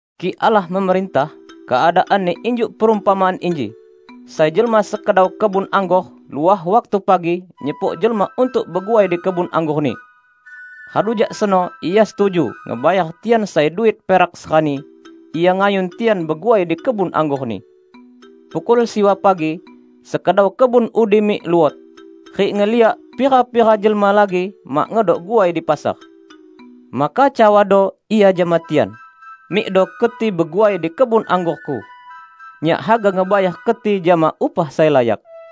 "Kik Allah memerintah, keadaanni injuk perumpamaan inji: Sai jelma sekedau kebun anggor luah waktu pagi nyepok jelma untuk beguai di kebun anggorni. Radu jak seno ia setuju ngebayar tian sai duit perak serani, ia ngayun tian beguai di kebun anggorni. Pukul siwa pagi, sekedau kebun udi mik luot, rik ngeliak pira-pira jelma lagi mak ngedok guai di pasar. Maka cawado ia jama tian, 'Mikdo keti beguai di kebun anggorku. Nyak haga ngebayar keti jama upah sai layak.'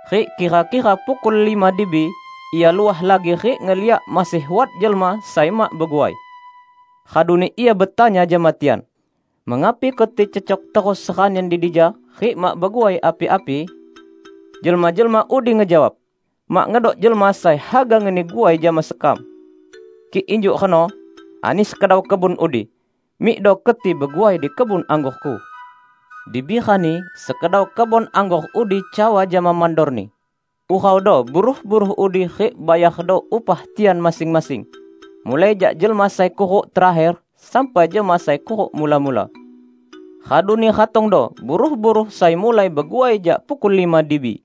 Rik kira-kira pukul lima dibi, ia luah lagi rik ngeliak masih wat jelma sai mak beguai. Raduni ia betanya jama tian, 'Mengapi keti cecok terus seranian di dija rik mak beguai api-api?' Jelma-jelma udi ngejawab, 'Mak ngedok jelma sai haga ngeni guai jama sekam.' 'Kik injuk reno,' ani sekedau kebun udi, 'mikdo keti beguai di kebun anggorku.' Dibi rani, sekedau kebun anggor udi cawa jama mandorni, 'Uraudo buruh-buruh udi rik bayardo upah tian masing-masing, mulai jak jelma sai kuruk terakher sampai jama sai kuruk mula-mula.' Raduni ratongdo buruh-buruh sai mulai beguai jak pukul lima dibi.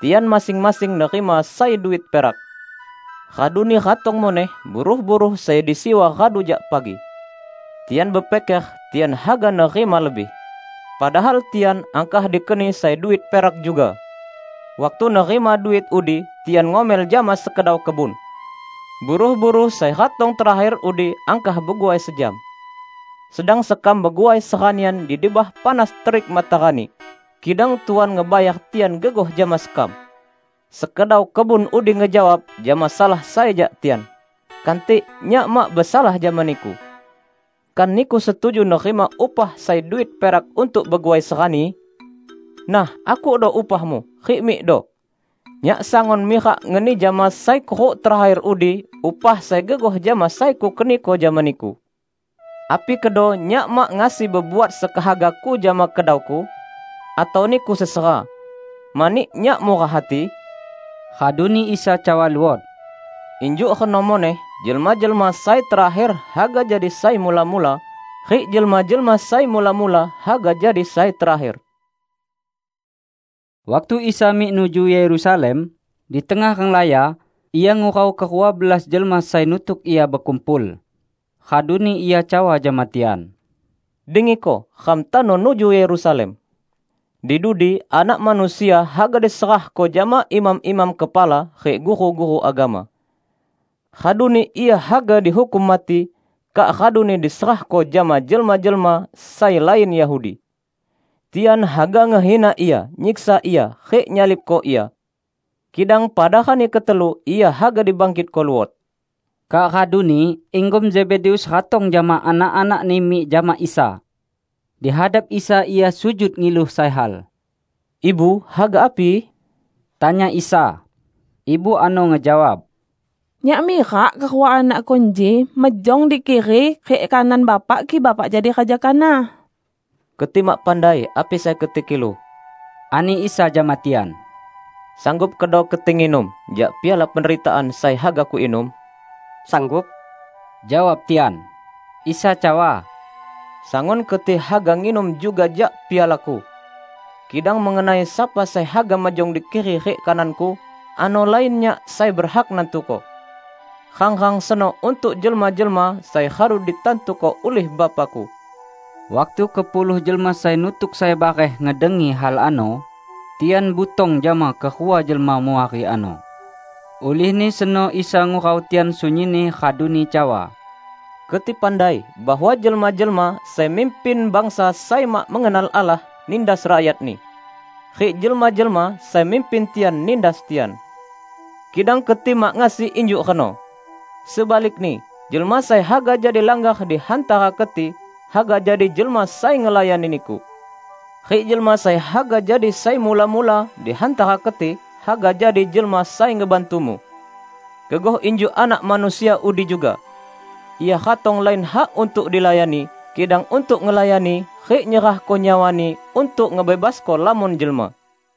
Tian masing-masing nerima sai duit perak. Raduni ratong muneh buruh-buruh sai di siwa radu jak pagi. Tian bepiker tian haga nerima lebih. Padahal tian angkah dikeni sai duit perak juga. Waktu nerima duit udi, tian ngomel jama sekedau kebun: 'Buruh-buruh sai ratong terakher udi angkah beguai sejam. Sedang sekam beguai seranian di debah panas terik matarani, kidang Tuan ngebayar tian gegoh jama sekam!' Sekedau kebun udi ngejawab jama salah sai jak tian, 'Kantik, nyak mak besalah jama niku. Kan niku setuju nerima upah sai duit perak untuk beguai serani? Nah, akukdo upahmu, rik mikdo. Nyak sangun mirak ngeni jama sai kuruk terakher udi upah sai gegoh jama sai kukeniko jama niku. Api kedo nyak mak ngasi bebuat sekehagaku jama kedauku? Atau niku sesera, mani nyak murah hati?' " Raduni Isa cawa luot, "Injuk reno muneh jelma-jelma sai terakher haga jadi sai mula-mula, rik jelma-jelma sai mula-mula haga jadi sai terakher." Waktu Isa mik nuju Yerusalem, di tengah renglaya Ia ngurau kerua belas jelma sai nutuk Ia bekumpul. Raduni Ia cawa jama tian, "Dengiko! Ram tano nuju Yerusalem. Di dudi Anak Manusia haga diserahko jama imam-imam kepala rik guru-guru agama. Raduni Ia haga dihukum mati, kak raduni diserahko jama jelma-jelma sai lain Yahudi. Tian haga ngehina Ia, nyiksa Ia, rik nyalibko Ia. Kidang pada rani ketelu, Ia haga dibangkitko luot." Kak raduni inggom Zebedeus ratong jama anak-anakni mik jama Isa. Dihadap Isa ia sujud ngilu sai hal. "Ibu haga api?" tanya Isa. Ibu ano ngejawab, "Nyak mirak kerua anakku inji mejong di kiri rik kanan Bapak kik Bapak jadi Raja kanah." "Keti mak pandai api sai keti kilu," ani Isa jama tian. "Sanggup kedo keti nginum jak piala penderitaan sai haga Kuinum?" "Sanggup," jawab tian. Isa cawa, "Sangun keti haga nginum juga jak piala-Ku. Kidang mengenai sapa sai haga mejong di kiri rik kanan-Ku, ano lain Nyak sai berhak nantuko. Rang-rang seno untuk jelma-jelma sai radu ditantuko ulih Bapa-Ku." Waktu kepuluh jelma sai nutuk sai bareh ngedengi hal ano, tian butong jama kerua jelma muari ano. Ulihni seno Isa ngurau tian sunyinni raduni cawa, "Keti pandai bahwa jelma-jelma sai mimpin bangsa sai mak mengenal Allah nindas rakyatni. Rik jelma-jelma sai mimpin tian nindas tian. Kidang keti mak ngasi injuk reno. Sebalikni, jelma sai haga jadi langgar di hantara keti, haga jadi jelma sai ngelayani niku. Rik jelma sai haga jadi sai mula-mula di hantara keti, haga jadi jelma sai ngebantumu. Gegoh injuk Anak Manusia udi juga: Ia ratong lain hak untuk dilayani, kidang untuk ngelayani, rik nyerahko nyawa-Ni untuk ngebebasko lamon jelma."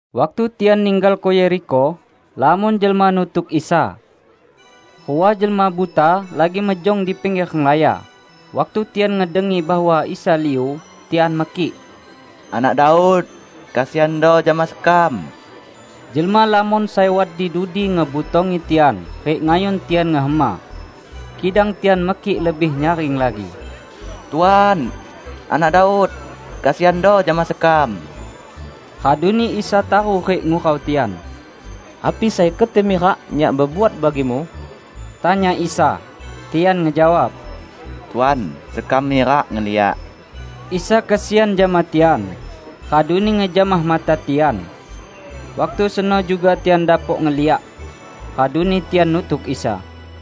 Waktu tian ninggalko Yerikho, lamon jelma nutuk Isa. Rua jelma buta lagi mejong di pingger renglaya. Waktu tian ngedengi bahwa Isa liu, tian mekik, "Anak Daud, kesiando jama sekam!" Jelma lamon sai wat di dudi ngebutongi tian rik ngayun tian ngehema. Kidang tian mekik lebih nyaring lagi, "Tuan, Anak Daud, kesiando jama sekam!" Raduni Isa taru rik ngurau tian. "Api sai keti mirak Nyak bebuat bagimu?" tanya Isa. Tian ngejawab, "Tuan, sekam mirak ngeliak!" Isa kesian jama tian, raduni ngejamah mata tian. Waktu seno juga tian dapok ngeliak. Raduni tian nutuk Isa.